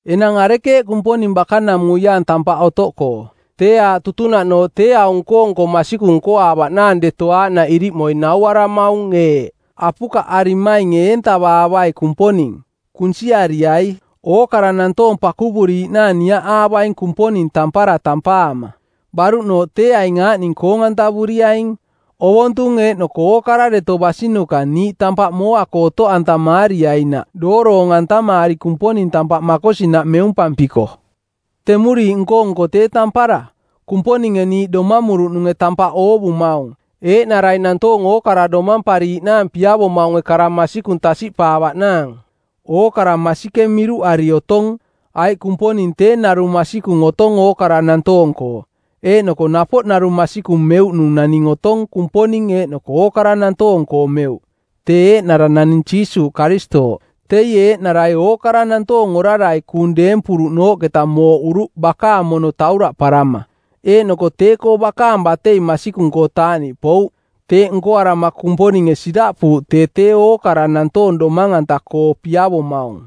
Enang arekeeꞌ Kumponing bakanamuiaang tampaꞌ otoꞌkoo? Tee aaꞌ tutunaꞌnooꞌ tee aung nko-nko masikung nkoaavaꞌnaang deto aaꞌnaꞌ iriꞌmoi nauaramaung eeꞌ: Apukaꞌarimainge eentavaavai Kumponing. Kunsiariai. Ookara nantoong pakuvuriiꞌnaang niaꞌaavaing Kumponing tampara tampaama. Baruꞌnooꞌ tee aaꞌning koong-antavuriaing: ovontung eeꞌnoko ookara deto basinuka niiꞌ tampaꞌ mooa-koo otoꞌantamaariainaꞌ dooroong-antamaari Kumponing tampaꞌ makosinaꞌ meumpampiko. Temuriiꞌ nko-nko tee tampara; Kumponinge niiꞌ domamuruꞌnunge tampaꞌ oovumaung, eeꞌnarai nantoong ookara domampariiꞌnaang piavomaunge kara masikung tasiꞌpaavaꞌnaang. Ookara masikeng miruꞌari otong, aiꞌ Kumponing tee narung masikung otong ookara nantoong-koo, eeꞌnoko napoꞌ narung masikung meuꞌnung naning otong Kumponing eeꞌnoko ookara nantoong-koo meuꞌ, tee eeꞌnara naning Jiisuuꞌ Karistooꞌ. Teie eeꞌnarai ookara nantoong orarai kuung deempuruꞌnooꞌketa mooꞌuruꞌ bakaang mono tauraꞌparama, eeꞌnoko tee-koo bakaang batei masikung-koo taaꞌniꞌpouꞌ. Teeꞌ nkoarama Kumponinge siraꞌpuuꞌ tee tee ookara nantoong domang-anta-koo piavomaung.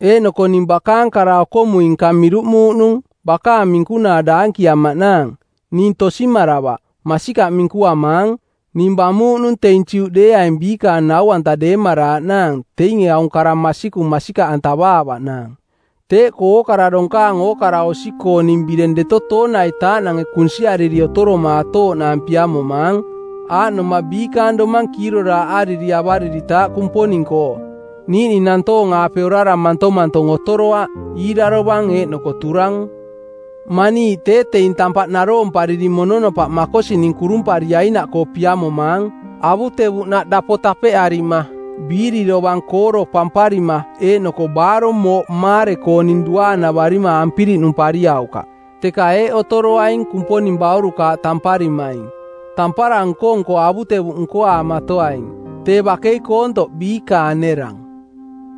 Eeꞌnoko ning bakaang kara-okomui-nka miruꞌmuuꞌnung bakaang minkunaa daankiamaꞌ naang. (Ning tosimaravaꞌ. Masikaꞌ minkuamaang.) Ning bamuuꞌnung teing Juꞌdeeaing biikaang nau-anta deemaraaꞌnaang teinge aung kara masikung masikaꞌantavaavaꞌnaang. Teeꞌkoo ookara donkaang ookara osi-kooning bireng deto tooniaitaaꞌnange kunsiariri otoromaatooꞌnaang piamomaang, aaꞌnoma biikaang domang kiiroraaꞌariri avariritaaꞌ Kumponing-koo, niiꞌning nantoong-aape orara mantomantong otoroaꞌ, iirarovang eeꞌnoko turang. Maniiꞌ tee teing tampaꞌ naroompariri mononopaꞌ makosining kurumpariainaꞌkoo piamomaang. Avutevuꞌnaꞌ dapo tapeꞌarima, biiri dovang kooro pamparima eeꞌnoko baarong mooꞌ maare-kooning duaanavarima ampirinumpariaukaꞌ. Teka eeꞌ otoroaing Kumponing baurukaaꞌ tamparimaing: tampara nko-nko avutevuꞌ nkoaamatoaing. Tee bakei koontoꞌ biikaang nerang.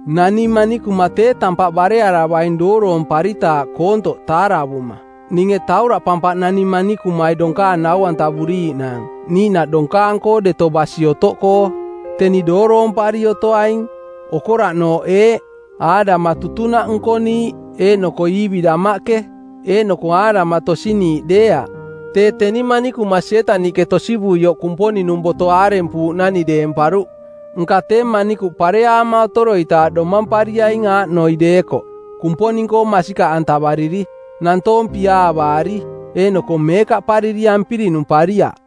Nani manikuma tee tampaꞌ barearavaing dooroomparitaaꞌ koontoꞌ taaravuma. Ninge tauraꞌpampaꞌ nani manikumai donkaang nau-antavuriiꞌnaang niiꞌnaꞌ donkaang-koo deto basi otoꞌkoo. Teni dooroompari otoaing. Okoraꞌnooꞌ eeꞌ: Aadama tutunaꞌ nkoniiꞌ eeꞌnoko Iivi damaꞌke. Eeꞌnoko Aadama tosiniiꞌdeeaꞌ, tee teni manikuma Sietaniꞌke tosivuioꞌ Kumponing-nung boto aarempuuꞌnani deemparuꞌ. Nka tee manikuꞌ pareaama otoroitaaꞌ domampariaing aaꞌnoi deekoꞌ: Kumponing-koo masikaꞌantavariri, nantoong piaavaari, eeꞌnoko meekaꞌpariri ampirinumpariaꞌ.